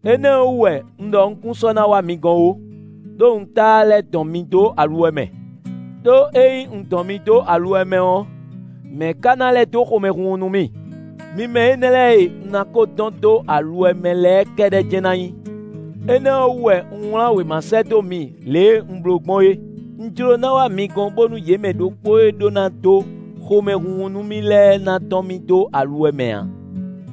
Énɛ́ ɔ́ wú wɛ, un ɖɔ un kún sɔ́ ná wá mi gɔ́n ó, ɖó un táá lɛ́ dɔn mi dó aluwɛ mɛ. Đó ényí un dɔn mi dó aluwɛ mɛ ɔ́, mɛ̌ ka ná lɛ́ dó xomɛhunhun nú mì? Mi mɛ énɛ́ lɛ́ɛ e un ná ko dɔn dó aluwɛ mɛ lɛ́ɛ kɛ́ɖɛ́ jɛ́n ná nyí! Énɛ́ ɔ́ wú wɛ un wlán wěma sɛ́ dó mi lě e un bló gbɔn é: un jló ná wá mi gɔ́n bónú yě mɛ ɖokpó e ɖó ná dó xomɛhunhun nú mì lɛ́ɛ ná dɔn mì dó aluwɛ mɛ ǎ.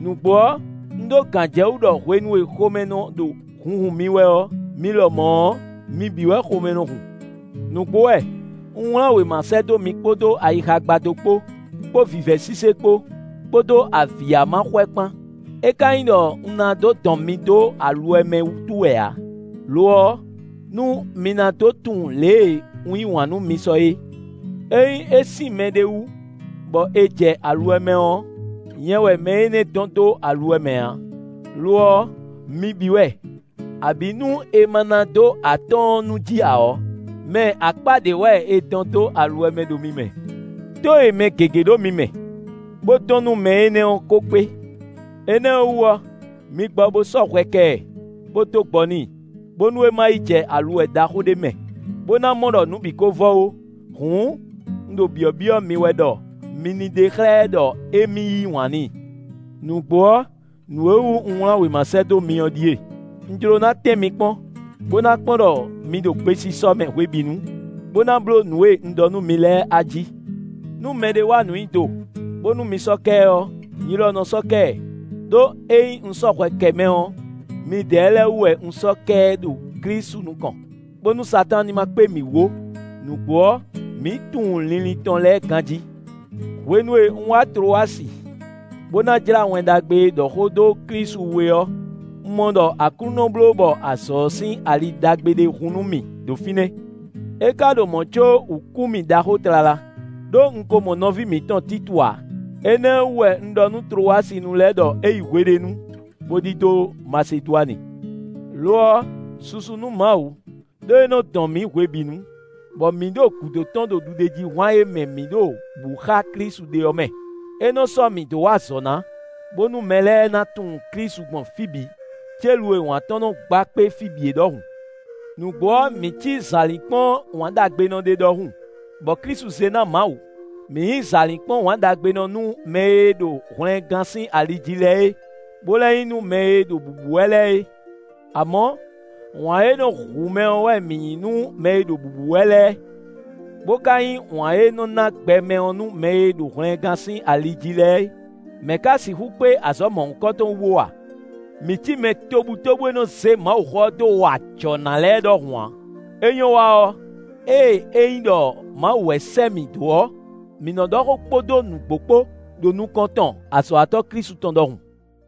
Nǔgbó ɔ́, un ɖó gǎnjɛwú ɖɔ hwenu e xomɛ nɔ ɖo hunhun mì wɛ ɔ́, mi lɔmɔ̌ ɔ́, mi bǐ wɛ xomɛ nɔ hun. Nǔgbó wɛ, un wlán wěma sɛ́ dó mi kpódó ayixa gbadó kpó, kpó vǐvɛ́ sise kpó, kpódó avǐ ya ma xwɛ kpán; é ka nyí ɖɔ un ná dó dɔn mi dó aluwɛ mɛ wútu wɛ ǎ; lo ɔ́, nú mi ná dó tunwun lě e un yí wǎn nú mi sɔ é. Ényí é sín mɛɖé wú bɔ è jɛ aluwɛ mɛ ɔ́, nyɛ wɛ mɛ énɛ́ dɔn dó aluwɛ mɛ ǎ; lo ɔ́, mi bǐ wɛ; abǐ nú è ma ná dó atɔ́ɔ́n nú jí ǎ ɔ́, mɛ akpá ɖé wɛ è dɔn dó aluwɛ mɛ ɖo mi mɛ. Tó e mɛ gěgé ɖo mi mɛ, bó dɔn nú mɛ énɛ́ ɔ́ ko kpé. Énɛ́ ɔ́ wú ɔ́, mi gbɔ bo sɔ́ hwɛ kɛ ɛ, bó dó gbɔ n'i, bónú é ma yí jɛ aluwɛ ɖaxó ɖé mɛ, bó ná mɔ ɖɔ nǔ bǐ ko vɔ ó. Hǔn, un ɖo byɔ̌byɔ́ mi wɛ ɖɔ mi ní ɖe xlɛ́ ɛ ɖɔ émí yí wǎn n'i. Nǔgbó ɔ́, nǔ e wú un wlán wěma sɛ́ dó mi ɔ́ ɖíe: un jló ná tɛ́n mi kpɔ́n, bó ná kpɔ́n ɖɔ mi ɖo gbesisɔ mɛ hwebǐnu, bó ná bló nǔ e un ɖɔ nú mi lɛ́ɛ ají. Nú mɛɖé wa nǔ nyi do, bónú mi sɔ́ kɛ ɛ ɔ́, nyi lɔ nɔ sɔ́ kɛ ɛ; ɖó ényí un sɔ́ hwɛ kɛ mɛ ɔ́, midɛɛ lɛ́ɛ wú wɛ un sɔ́ kɛ ɛ ɖo Klísu nukɔn, bónú Satáan ní ma kpé mǐ wú ó; nǔgbó ɔ́, mǐ tunwun linlin tɔn lɛ́ɛ ganjí. Hwenu e un wá Tlowasi, bó ná jlá Wɛn Ɖagbe e ɖɔ xó dó Klísu wú é ɔ́, un mɔ ɖɔ Aklúnɔ bló bɔ azɔ̌ ɔ́ sín ali ɖagbe ɖé hun nú mì ɖo fínɛ́. É ka ɖo mɔ̌ có wǔ kú mì ɖaxó tlala, ɖó un ko mɔ nɔví mǐtɔn Títu ǎ. Énɛ́ ɔ́ wú wɛ un ɖɔ nú Tlowasinu lɛ́ɛ ɖɔ é yi hweɖénu, bó ɖidó Masedwani. Lo ɔ́, susu nú Mawu, ɖó é nɔ dɔn mǐ hwebǐnu, bɔ mǐ ɖo gúdo tɔn ɖo ɖuɖéjíhwan e mɛ mǐ ɖo bǔ xá Klísu ɖe ɔ́ mɛ. É nɔ sɔ́ mǐ dó wa azɔ̌ ná, bónú mɛ lɛ́ɛ ná tunwun Klísu gbɔn fí bǐ, célu e wǎn tɔn nɔ gba kpé fí bǐ é ɖɔhun. Nǔgbó ɔ́, mǐ cí zǎlínkpɔ́n wǎnɖagbenɔ ɖé ɖɔhun, bɔ Klísu zé ná Mawu; mǐ nyǐ zǎlínkpɔ́n wǎnɖagbenɔ nú mɛ e ɖo hwlɛngán sín ali jí lɛ́ɛ é, bó lɛ́ nyí nú mɛ e ɖo bǔbú wɛ lɛ́ɛ é. Amɔ̌, wǎn e nɔ hu mɛ ɔ́ wɛ mǐ nyí nú mɛ e ɖo bǔbú wɛ lɛ́ɛ, bó ka nyí wǎn e nɔ ná gbɛ mɛ ɔ́ nú mɛ e ɖo hwlɛngán sín ali jí lɛ́ɛ é. Mɛ̌ ka sixú kpé azɔ̌ mɔ̌hunkɔtɔn wú bó wa? Mǐ cí mɛ tobutóbú e nɔ zé Mawuxó ɔ́ dó wa ajɔ̌ ná lɛ́ɛ ɖɔhun ǎ. É nyɔ́ wa ɔ́, ée é nyí ɖɔ Mawu wɛ sɛ́ mǐ dó ɔ́, mǐ nɔ ɖɔ xó kpódó nǔgbó kpó ɖo nukɔn tɔn azɔ̌watɔ́ Klísu tɔn ɖɔhun.